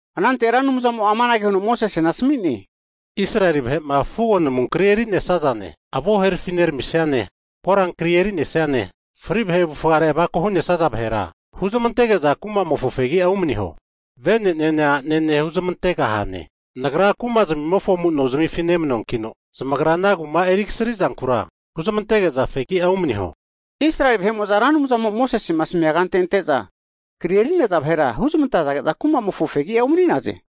Anante Ra Anumzamo amanage huno Mosesena asmi'ne, Israeli vahe'ma fugo namu kri eri'nesazane, avo' herafineramisiane, korankri eri'nesiane, fri' vahe avufgare avako hu'nesaza vahera, huzmantege'za kumamofo fegi'a umaniho. Vene, a'nene huzmante'gahane, Nagra kumazmimofona amu'nozmifi nemanuankino, zamagra ana kuma eri kasri'zankura huzmante'geza fegi'a umaniho. Israeli vahe'mo'za Ra Anumzamo'ma Mosesema asmia kante ante'za kri eri'naza vahera huzmantage'za kumamofo fegi'a umani'naze.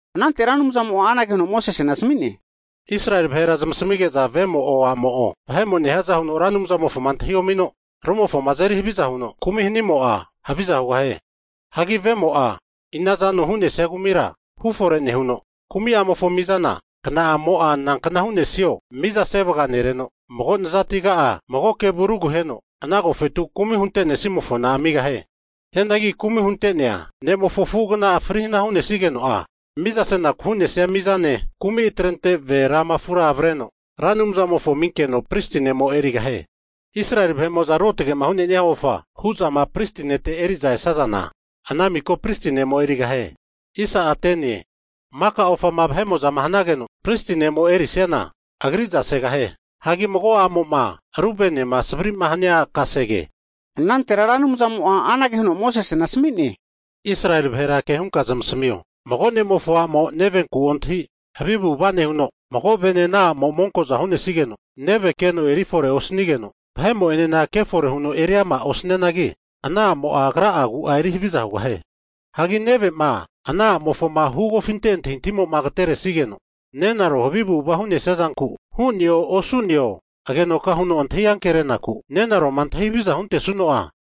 Anante Ra Anumzamo anage huno Mosesena asmi'ne, Israeli vahera zamasamige'za vemo'o, a'mo'o vahe'mo nehiaza huno Ra Anumzamofo antahi omino rumofoma azeri haviza huno kumi hanimo'a, haviza hugahie. Hagi vemo'a inazano hu'nesia kumira hufore nehuno, kumi'amofo mizana kna'amo nankna hu'nesio miza sevaga nereno, mago nazatigati mago kevu ruguheno ana agofetu kumi huntene'snimofona amigahie. Hianagi kumi hunte'nea ne'mofo afu'agnama fri hana hu'nesigeno'a, miza senaku hu'nesia mizane, kumi atrente ve rama afura avreno Ra Anumzamofo aminkeno pristi ne'mo erigahie. Israeli vahe'mo'za ruotge hu'nenia ofa hu'zama pristi nete eri'za esazana, ana miko pristi ne'mo erigahie. Maka ofama vahe'mo'ma hanageno pristi ne'mo'ma erisiana agriza segahie. Hagi mago a'mo'ma ru venema savri hania zamofo kasege. Anantera Ra Anumzamo'a anage huno Mosesena asami'ne, Israeli vahera ke hunka zamasmio, mago ne'mofo a'mo nevenku ontahi havi avu'ava nehuno, mago ve'ne ana a'mo monko'za hu'nesigeno, neve keno erifore osanigeno vahe'mo'enena kefore huno eri ama osnianagi, ana a'mo'a agra'a agu'a eri haviza hugahie. Hagi neve'ma ana a'mofoma hugofinte antahi antahimo agateresigeno nenaro havi avu'ava hu'nesia zanku, hu'neo osu'neo agenoka huno antahi anke'renaku, nenaroma antahi havizama huntesuno'a,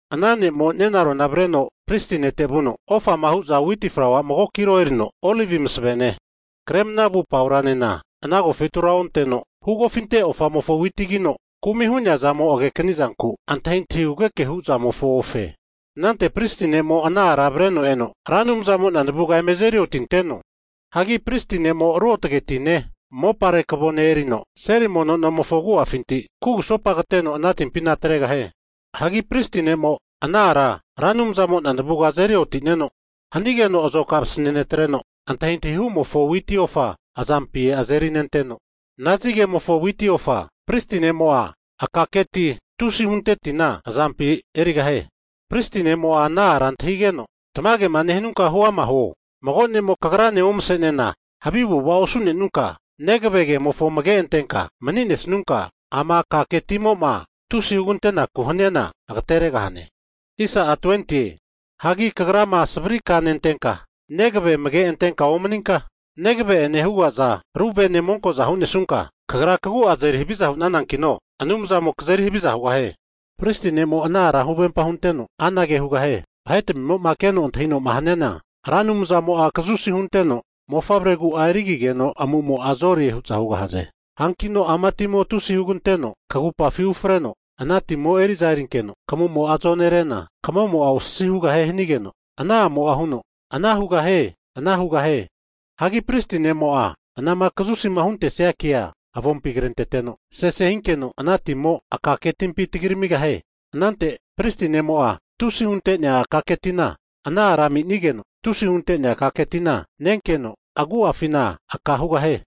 ana ne'mo nenarona avreno pristi nete vuno, ofama hu'za witi flaua mago kilo erino, olivi masvene, kremna vu pauranena ana agofetura onteno, hugofinte ofamofo witigino kumi' hu'neazamo agekni zanku, antahi antahi hugeke hu'mofo ofe. Anante pristi ne'mo ana ara avreno eno Ra Anumzamo'na navuga eme azeri otinteno. Hagi pristi ne'mo ruotge hu'nea tine, mopare kavone erino, seli mono nomofo agu'afinti kugusopa kateno ana timpina atregahie. Hagi pristi ne'mo'a ana ara Ra Anumzamo'na navuga azeri otineno, hanigeno azokara vasane netreno, antahi antahi hu'mofo witi ofa azampi erinenteno, nazinkere'ma hu ofa witi pristi ne'mo'a akake ti tusi hunte tina azampina erigahie. Pristi ne'mo'a ana ara antahigeno, tamagema nehanunka huama huo, mago ne'mo kagrane omse'nena havi avu'ava osu'nesunka, negave kemofo amage antenka mani'nesnunka, ama akake timo tusi hugantenaku hniana agateregahane. Hagi kagrama savri ka nentenka, negave amage antenka omaninka, negave'ene hugaza ru vene monko'zama hunesunka, kagra kagu'a azeri haviza hu'nanankino Anumzamo kazeri haviza hugahie. Pristi ne'mo'a ana ara huvempa hunteno anage hugahie, vahetamimo'ma keno antahinoma haniana, Ra Anumzamo'a kazusi hunteno mofavregura erigigeno amu'mo'a zore hu'za hugahaze. Hankino ama timo tusi huganteno kagupafi ufreno, ana timo eri'za erinkeno kamumo zonerena, kamo'ma osasi hugahie hanigeno, ana a'mo'a huno, ana hugahie. Ana hugahie. Hagi pristi ne'mo'a anama kazusima huntesia kea avompi krenteteno sese hinkeno ana timo'a akake timpi tagi ramigahie. Anante pristi ne'mo'a tusi hunte'nea akake tina ana a'ra ami'nigeno, tusi huntenea akake tina nenkeno agu'afi aka hugahie.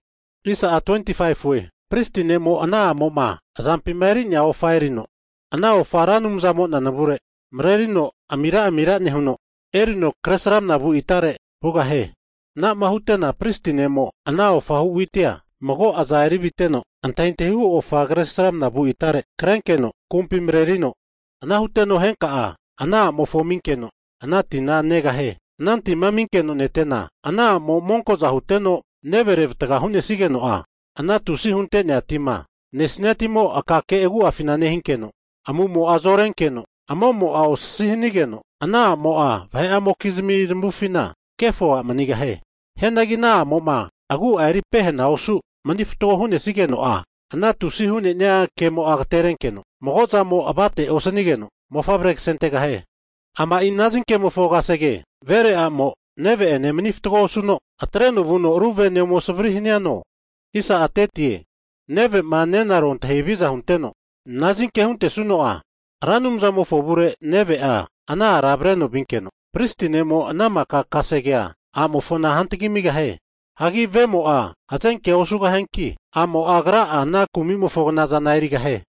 Pristi ne'mo ana a'moma azampima eri'nea ofa erino, ana ofa Ra Anumzamo'na navure marerino amira amira nehuno, erino kresramna vu itare (alta) vugahie. Anama hute'na pristi ne'mo ana ofahu witia, mago aza eri viteno antahi antahihu ofa Kresramana vu itare (alta) krenkeno kumpi marerino. Ana huteno henka ana a'mofo aminkeno ana tina negahie. Ana tima aminkeno netena, ana a'mo monkoza huteno neve revatga hu'nesigeno'a, ana tusi hunte'nea (kes) tima nesnia timo'a akake agu'afina nehinkeno, amu'mo'a zorenkeno, amo'mo'a osasi hanigeno, ana a'mo'a vahe'amokizmi zamufina kefo a' manigahie. Hianagi a'mo'ma agu'a eri pehena osu mani fatgo hu'nesnigeno'a, ana tusi (kes) hu'nenia kemo'a agaterenkeno, mago zamo avate osnigeno mofavre kasentegahie. Ama'i nazinkemofo kasege, vere a'mo neve'ene mani fatgo osuno atreno vuno ru vene ome savri haniano, neve'ma nenaro antahi haviza hunteno nazinke huntesuno'a, Ra Anumzamofo avure neve'a ana ara avreno vinkeno pristi ne'mo ana maka kasegea a'mofona hantagi amigahie. Hagi vemo'a hzenke osugahianki, a'mo agra'a ana kumi'mofo knazana erigahie.